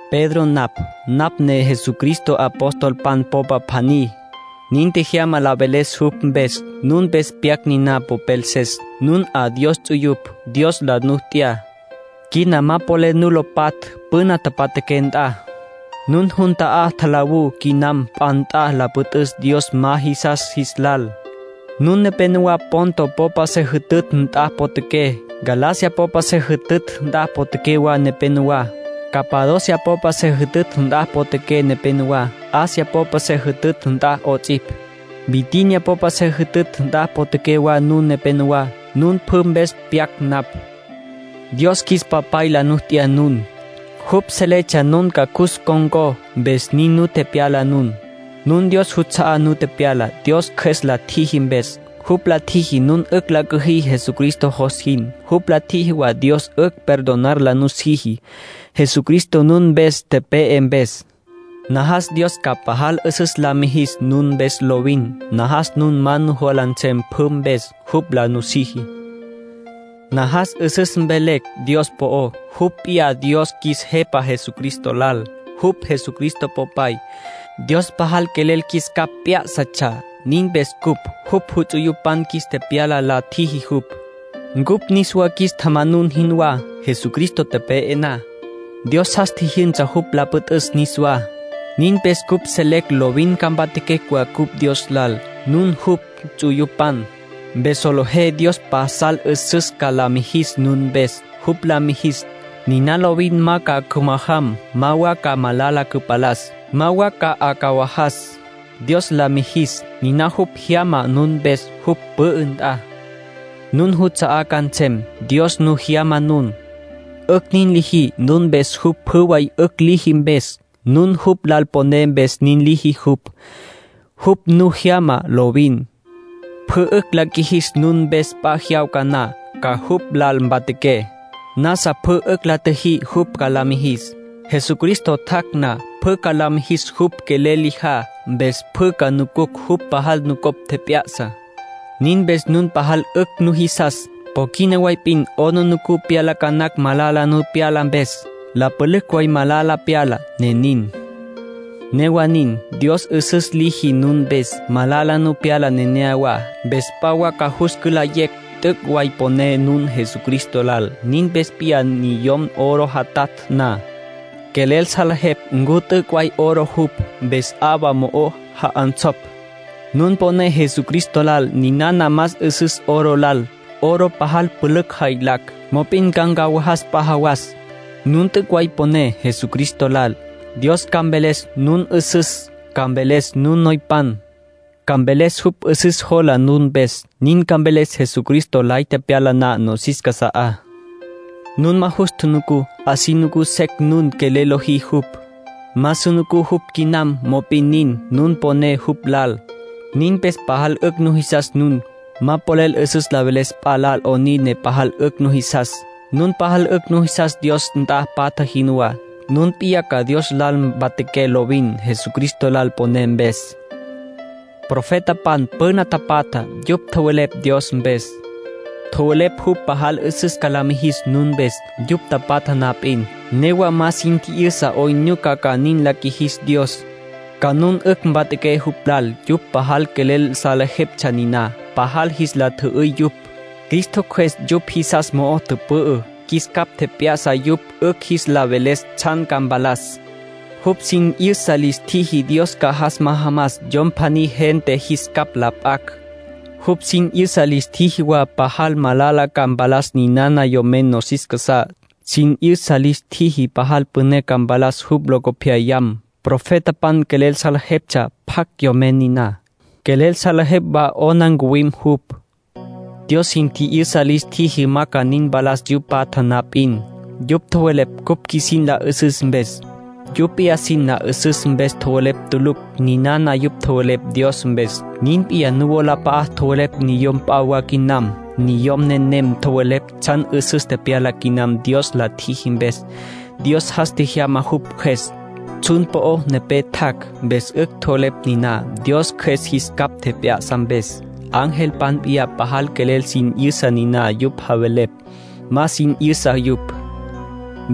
Pedro napj. Napj ne Jesucristo apostolpan popa pjaní. Nin tjejyama la veles jupj mpes. Nun mpes pyac niná popelses, nun 'a Dios ts'uyupj. Dios la nu t'ya. Quina ma polel nu lo patj püna tapatjaqué nt'a. Nun pjü jun ta'á tjalawú quinam p'a nt'a la püt'üs Dios ma jisas jis lal. Nun nepénowa Ponto popa se jütütj nt'a potjaqué, Galacia popa se jütütj nt'a potjaqué wa nepenowá, Capadocia popa se jütütj nt'a potjaqué nepenowá, Asia popa se jütütj nt'a 'ots'ipj, Bitinia popa se jütütj nt'a potjaqué wa nun nepenowá. Nun pjü mpes pyac napj. Dios qjuis Papay la nu t'ya nun. Jupj seletsja nun ca cus ncon̈có, mpes nin nu tepyala nun. Nun Dios juts'a'á nu tepyala, Dios Cjües la tjiji mpes. Jupj la tjiji nun 'ücj la cüjí Jesucristo jos jin. Jupj la tjiji wa Dios 'ücj perdonar la nutjiji, Jesucristo nun mpes tepe'e mpes. Najas Dios ca pajal 'üsüs la mijis nun mpes lovin. Najas nun ma nujola nsem pjü mpes, jupj la nusiji. Najas 'üsüs velecj Dios po'ó. Jupj p'iyá Dios qjuis Jepa Jesucristo lal. Jupj Jesucristo Popay. Dios pajal quelel qjuis capj p'yá'satsja. Nin mpes cupj jupj ts'uyupan qjuis tepyala la tjiji jupj, ncupj niswa qjuis tjamanun jinwá. Jesucristo tepe'e na, Dios jas tjijyünsa jupj la püt'üs niswá. Nin mpes cupj selecj lovin ca mpatjaquecj wa cupj Dios lal. Nun jupj ts'uyupan, mpes solejé Dios pasal 'üsüs ca la mijis nun mpes. Jupj la mijis, niná lovin ma ca cümajam, ma wa ca malala cüpalas, ma wa ca 'acawajas. Dios la mijis, niná jupj jyama nun mpes jupj pü'ü nt'a. Nun nuts'a'á ca nsem. Dios nu jyama nun. 'Ücj nin liji nun mpes jupj pjü way 'ücj liji mpes. Nun jupj lal poné mpes nin liji jupj. Jupj nu jyama lovin, pjü 'ücj la qjuijis nun mpes p'a jyawca na, ca jupj lal mpatjaqué. Nasa pjü 'ücj la tjiji jupj ca la mijis. Jesucristo tjac' na, pjü ca la mijis jupj quelel lijá, mpes pjü ca nucucj jupj pajal nucopj tjep'ya'sa. Nin mpes nun pajal 'ücj nujisas. Po quina way p'in 'aplijila nu pyala ca nacj malala nu pyala mpes. La pülücj way malala pyala, ne nin. Newa nin, Dios 'üsüs liji nun mpes. Malala nu pyala neneyawá, mpes p'a wa ca jus cülayecj t'üc' way poné nun Jesucristo lal. Nin p'iyá niyom oro jatatj na, quelel salejepj ncu t'üc' way oro jupj, mpes 'awa mo'o ja'onsopj. Nun poné Jesucristo lal; ninana más 'üsüs oro lal. Oro pajal pülücj jaylacj, mop'in ca ncawajas p'a jawas. Nun t'üc' way poné Jesucristo lal, Dios ca mveles nun 'üsüs, ca mveles nun noypan. Ca mveles jupj 'üsüs jola nun mpes. Nin ca mveles Jesucristo lay tepyala na nosis casa'á. Nun ma jus tjunucú; así nucú secj nun quelel lojí jupj. Ma su nucú jupj quinam; mop'in nin, nun poné jupj lal. Nin mpes pajal 'ücj nujisas nun. Ma polel 'üsüs la veles p'a lal 'onin ne pajal 'ücj nujisas. Nun pajal 'ücj nujisas Dios nt'a patja jinwá. Nun p'iyá ca Dios lal mpatjaqué lovin, Jesucristo lal poné mpes. Profetapan püna tapatjá, yupj tjowelepj Dios mpes. Tjowelepj jupj pajal 'üsüs ca la mijis nun mpes. Yupj tapatja na p'in, newa ma sin tji'yüsa 'oyn nyuca ca nin la qjuijis Dios, ca nun 'ücj mpatjaqué jupj lal. Yupj pajal quelel salejeptsja niná, pajal jis la tjü'üy yupj. Cristo Cjües yupj jisas mo'o tüpü'ü. Jis capj tjep'ya'sa yupj 'ücj jis la veles tsjan ca mpalas. Jupj sin 'yüsa lis tjiji Dios ca jas majamas Yom pjaní gente jis capj la p'acj. Jupj sin 'yüsa lis tjiji wa pajal malala ca mpalas ninana Yomen nosis casá; sin 'yüsa lis tjiji pajal püné ca mpalas jupj locopyayam. Profetapan quelel salejeptsja pjacj Yomen niná. Quelel salejeptsja wa 'ona ncuwim jupj. Dios sin tji'yüsa lis tjiji ma ca nin mpalas yupj patja na p'in. Yupj tjowelepj cupj qjuisin la 'üsüs mpes; yupj p'iyá sin la 'üsüs mpes tjowelepj tulucj. Ninana yupj tjowelepj Dios mpes, nin p'iyá nuwolap'a'á tjowelepj niyom p'a wa quinam. Niyom nenem tjowelepj tsjan 'üsüs tepyala quinam Dios la tjiji mpes. Dios jas tjejyama jupj Cjües, tsjun po'o nepé tjac'. Mpes 'ücj tjowelepj niná, Dios Cjües jis capj tjep'ya'sa mpes. Angelpan p'iyá pajal quelel sin 'yüsa niná yupj javelepj. Ma sin 'yüsa yupj.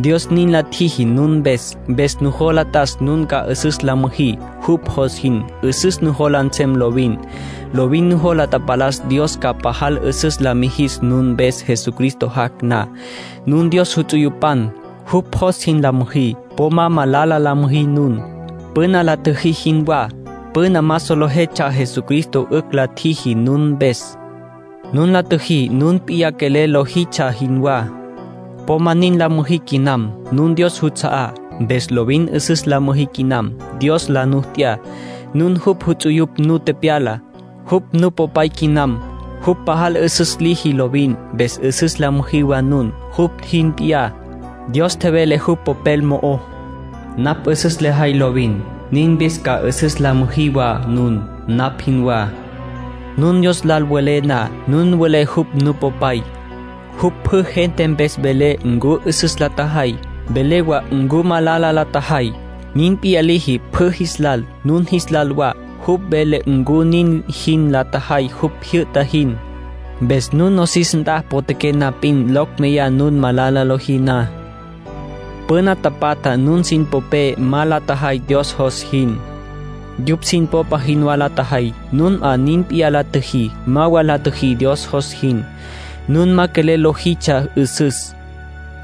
Dios nin la tjiji nun mpes. Mpes nujola t'as nun ca 'üsüs la müjí, jupj jos jin. 'Üsüs nujola nsem lovin. Lovin nujola tapalas Dios ca pajal 'üsüs la mijis nun mpes Jesucristo jac' na. Nun Dios ts'uyupan. Jupj jos jin la müjí. Po ma malala la müjí nun, püna la tjüjí jinwá. Püna ma solejetsja Jesucristo 'ücj la tjiji nun mpes. Nun la tjüjí nun p'iyá quelel lojitsja jinwá. Po ma nin la müjí quinam. Nun Dios juts'a'á, mpes lovin 'üsüs la müjí quinam. Dios la nu t'ya, nun jupj ts'uyupj nu tepyala. Jupj Nupopay quinam. Jupj pajal 'üsüs liji lovin, mpes 'üsüs la müjí wa nun, jupj jin p'iyá. Dios tjevele jupj Popel mo'ó: “Napj 'üsüs lejay lovin. Nin mpes ca 'üsüs la müjí wa nun, napj jinwá”, nin tjevele Dios. Nun Dios lal welé na, nun welé jupj Nupopay. Jupj pjü gente mpes vele ncu 'üsüs la tjajay, vele wa ncu malala la tjajay. Nin p'iyá liji pjü jis lal, nun jis lal wa. Jupj vele ncu nin jin la tjajay jupj tjijyü'ta jin. Mpes nun nosis nt'a potjaqué na p'in, locj meyá nun malala lojí na. Püna tapatja nun sin popé ma la tjajay Dios jos jin. Yupj sin popa jinwá la tjajay. Nun 'a nin p'iyá la tjüjí. Ma wa la tjüjí Dios jos jin. Nun ma polel lojitsja 'üsüs.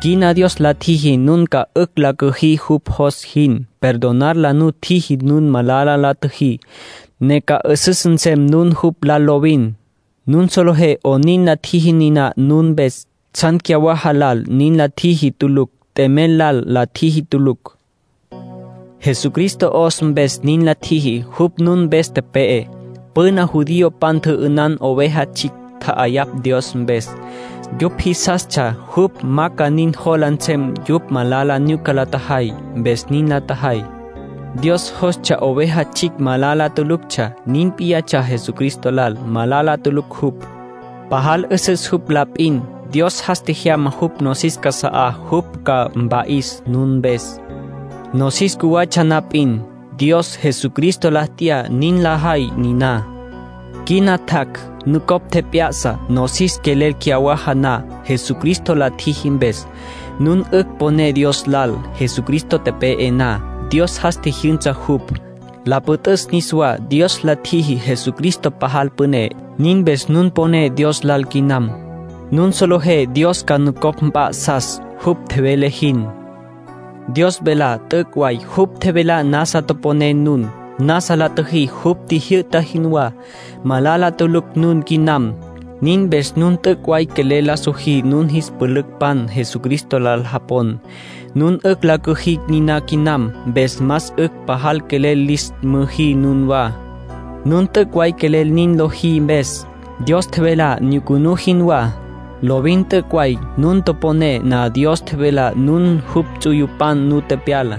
Quina Dios la tjiji nun ca 'ücj la cüjí jupj jos jin. Perdonar la nu tjiji nun malala la tjüjí, ne ca 'üsüs nsem nun jupj lal lovin. Nun solejé 'onin la tjiji niná nun mpes. Tsjan cyawaja lal nin la tjiji tulucj. T'emel lal la tjiji tulucj. Jesucristo 'os mpes nin la tjiji. Jupj nun mpes tepe'e. Püna judiopan tjü'ünan oveja tsjicj, tja'ayapj Dios mpes. Yupj jisastsja jupj ma ca nin jola nsem yupj malala nyuca la tjajay, mpes nin la tjajay. Dios jostsja oveja tsjicj malala tuluctsja. Nin p'iyatsja Jesucristo lal. Malala tulucj jupj. Pajal 'üsüs jupj la p'in. Dios jas tjejyama jupj nosis casa'á jupj ca mpa'is nun mpes. Nosis cjuwatsja na p'in, Dios Jesucristo la t'ya nin la jay niná. Quina tjac', nucopj tjep'ya'sa, nosis quelel cyawaja na. Jesucristo la tjiji mpes, nun 'ücj poné Dios lal. Jesucristo tepe'e na, Dios jas tjijyünsa jupj, la püt'üs niswá. Dios la tjiji Jesucristo pajal püné. Nin mpes nun poné Dios lal quinam. Nun solejé Dios ca nucopj mp'a'sas, jupj tjevele jin. Dios velá t'üc' way. Jupj tjevelá nasa toponé nun. Nasa la tjüjí jupj tjijyü'ta jinwá. Malala tulucj nun quinam. Nin mpes nun t'üc' way quelel la sojí nun jis pülücpan Jesucristo lal japon. Nun 'ücj la cüjí niná quinam. Mpes más 'ücj pajal quelel lis müjí nunwá, nun t'üc' way quelel nin lojí mpes. Dios tjevelá nyucunú jinwá. Lovin t'üc' way. Nun toponé na Dios tjevelá, nun jupj ts'uyupan nu tepyala,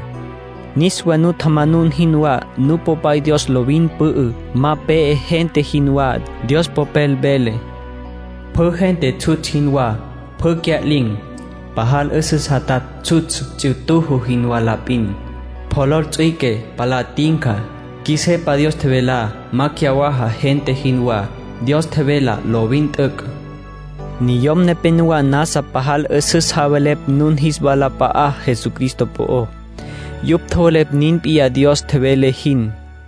niswa nu tjamanun jinwá. Nupopay Dios lovin pü'ü, ma pe'e gente jinwá. Dios Popel vele: “Pjü gente tsjutsj jinwá, pjü cya'lin̈. Pajal 'üsüs jatatj tsjutsj ts'ituju jinwá la p'in. Polol ts'üique, palá tinca. Qjuis Jepa Dios tjevelá ma cyawaja gente jinwá. Dios tjevelá lovin t'üc'.” Niyom nepenowá nasa pajal 'üsüs tjowelepj nun jis walap'a'á Jesucristo po'ó. Yupj tjowelepj nin p'iyá Dios tjevele jin.